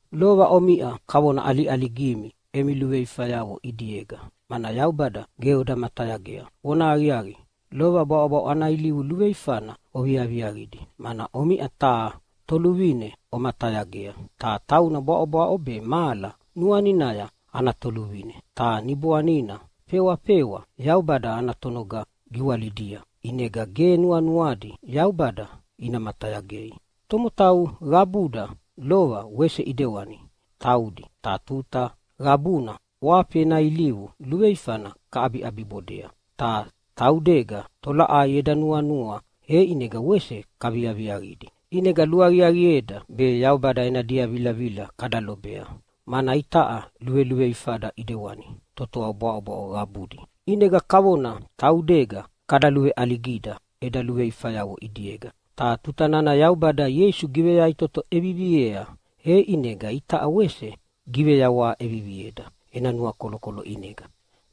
Lova omiʼa kavona ʼaliʼaligimi emi luveifayavo ʼidiega, mana Yaubada ge oda matayagea. Vonahaqiaqi, lova bwaʼobwaʼo ana ilivu luveifana oviaviaqidi, mana omiʼa taha toluvine omatayagea, ta tauna bwaʼobwaʼo be mahala nuaninaya ana toluvine. Ta niboanina fewafewa Yaubada ana tonoga giwalidia ʼinega ge nuanuadi Yaubada ina matayagei. Tomotau qabuda lova wese ʼidewani taudi, ta tuta qabuna ʼwafi ena ilivu luveifana kaʼabiʼabibodea. Ta taudega tolaʼai eda nuanua e ʼinega wese kaviaviaqidi. ʼInega luaqiaqieda be Yaubada ena diavilavila kada lobea, mana itaʼa luveluveifada ʼidewani totoa bwaʼobwaʼo qabudi. ʼInega kavona taudega kada luveʼaligida eda luveifayavo ʼidiega. Ta tuta nana Yaubada Ieisu giveyaʼitoto ʼeviviea e ʼinega itaʼa wese giveyawaha ʼevivieda ena nuakolokolo ʼinega,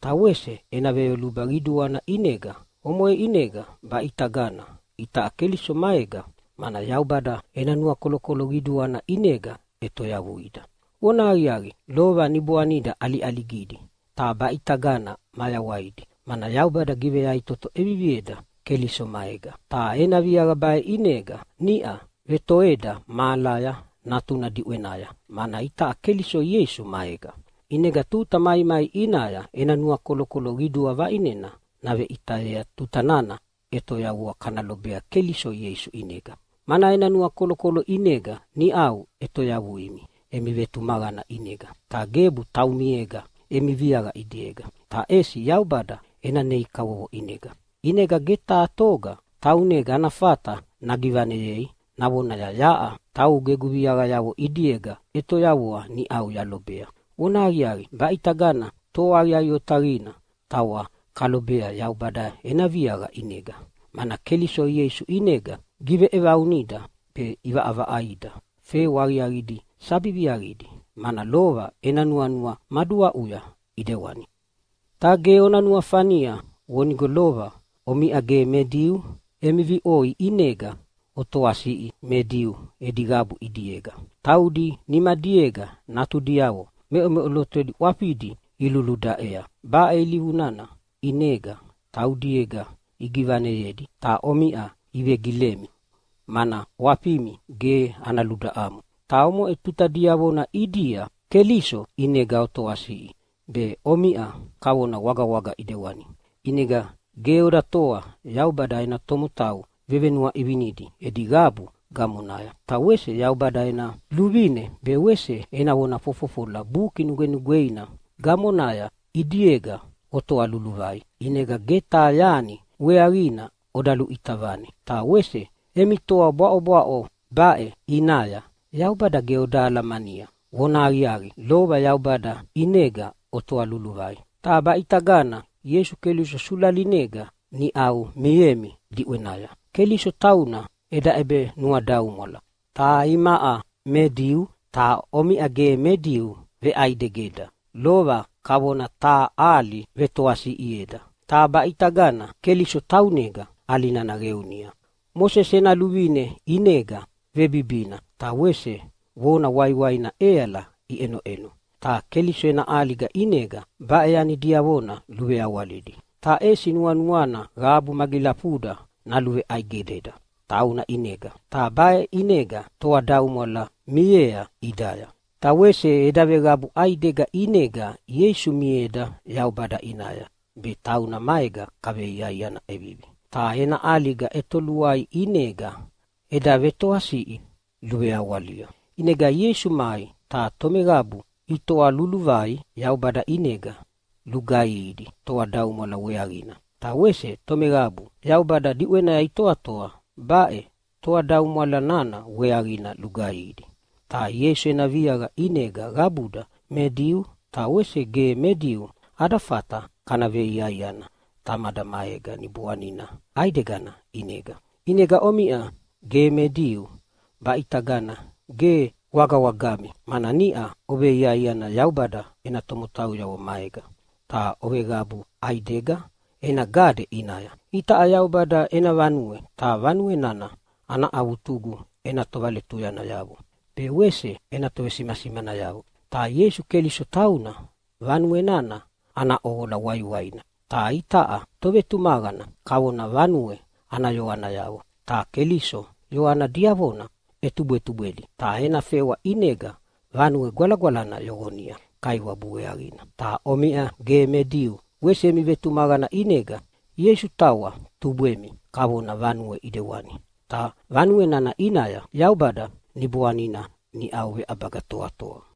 ta wese ena veyoluba qiduana ʼinega. Omoʼe ʼinega baʼitagana itaʼa Keliso maega, mana Yaubada ena nuakolokolo qiduana ʼinega ʼetoyavuida. Vona aqiaqi, lova niboanida ʼaliʼaligidi, ta baʼitagana mayawaidi, mana Yaubada giveyaʼitoto ʼevivieda Keliso maega. Ta ena viaqa baʼe ʼinega niʼa vetoeda mahalaya Natuna diʼwenaya, mana itaʼa Keliso Ieisu maega. ʼInega tuta maimai ʼinaya ena nuakolokolo qidua vaʼinena naveʼitayea tuta nana ʼetoyavua kana lobea Keliso Ieisu ʼinega. Mana ena nuakolokolo ʼinega niʼau ʼetoyavuimi emi vetumaqana ʼinega. Ta gebu taumiega emi viaqa ʼidiega, ta ʼesi Yaubada ena nei kavovo ʼinega. ʼInega ge taha toga taunega ana fata nagivaneyei navonaya, “Yaʼa taugu egu viaqayavo ʼidiega ʼetoyavua niʼau yalobea.” Vonahaqiaqi, baʼitagana toa aqiaqi otaqina tawa kalobea Yaubada ena viaqa ʼinega, mana Keliso Ieisu ʼinega giveʼevaunida be ʼivaʼavaʼaida fewa aqiaqidi sabi viaqidi, mana lova ena nuanua maduaʼuya ʼidewani. Ta ge ona nuafania vonigo lova omiʼa ge me Diu emi viʼoi ʼinega otoasiʼi me Diu edi qabu ʼidiega. Taudi nimadiega natudiavo meʼomeʼolotodi ʼwafidi iluludaʼea. Baʼe ilivu nana ʼinega taudiega igivaneyedi, ta omiʼa ivegilemi mana ʼwafimi ge ana ludaʼamo. Ta omoʼe tuta diavona ʼidia Keliso ʼinega otoasiʼi, be omiʼa kavona wagawaga ʼidewani, ʼinega ge oda toa Yaubada ena tomotau vevenuaʼivinidi edi qabu gamonaya. Ta wese Yaubada ena luvine be wese ena vona fofofola Buki Nugwenugweina gamonaya ʼidiega otoa luluvai. ʼInega ge taha yani weaqina oda luʼita vane, ta wese emi toa bwaʼobwaʼo baʼe ʼinaya Yaubada ge oda alamania. Vona aqiaqi, lova Yaubada ʼinega otoa luluvai, ta baʼitagana Ieisu Keliso sulalinega niʼau miemi diʼwenaya. Keliso tauna eda ʼebenuadaumwala, ta imaʼa me Diu ta omiʼa ge me Diu veʼaidegeda. Lova kavona taha ʼali vetoasiʼieda, ta baʼitagana Keliso taunega ʼali nana qeunia. Mosese ena luvine ʼinega vebibina ta wese vona waiwaina ʼeala iʼenoʼeno, ta Keliso ena ʼaliga ʼinega baʼe yani diavona luveawalidi, ta ʼesi nuanuana qabu magilafuda naluveʼaidegeda tauna ʼinega. Ta baʼe ʼinega toadaumwala miea ʼidaya. Ta wese eda veqabu ʼaidega ʼinega Ieisu mieda Yaubada ʼinaya be tauna maega kaveiaiana ʼevivi. Ta ena ʼaliga ʼetoluaia ʼinega eda vetoatoasiʼi luveawalia. ʼInega Ieisu mai ta tomeqabu itoa luluvai Yaubada ʼinega lugaihidi toadaumwala weaqina, ta wese tomeqabu Yaubada diʼwenaya itoatoa baʼe toadaumwala nana weaqina lugaihidi. Ta Ieisu ena viaqa ʼinega qabuda me Diu ta wese ge me Diu ada fata kana veiaiana Tamada maega Niboanina ʼaidegana ʼinega. ʼInegana omiʼa ge me Diu baʼitagana ge wagawagami, mana niʼa oveiaiana Yaubada ena tomotauyavo maega, ta oveqabu ʼaidega ena gade ʼinaya. Itaʼa Yaubada ena vanue, ta vanue nana ana avutugu ena tovaletuyanayavo be wese ena tovesimasimanayavo. Ta Ieisu Keliso tauna vanue nana ana ʼoqola waiwaina. Ta itaʼa tovetumaqana kavona vanue ana yoanayavo, ta Keliso yoana diavona ʼetubwetubwedi, ta ena fewa ʼinega Vanue Gwalagwalana yoqonia Kaiwabu weaqina. Ta omiʼa ge me Diu wese emi vetumaqana ʼinega Ieisu tawa tubwemi kavona vanue ʼidewani, ta vanue nana ʼinaya Yaubada Niboanina niʼau veʼabaga toatoa.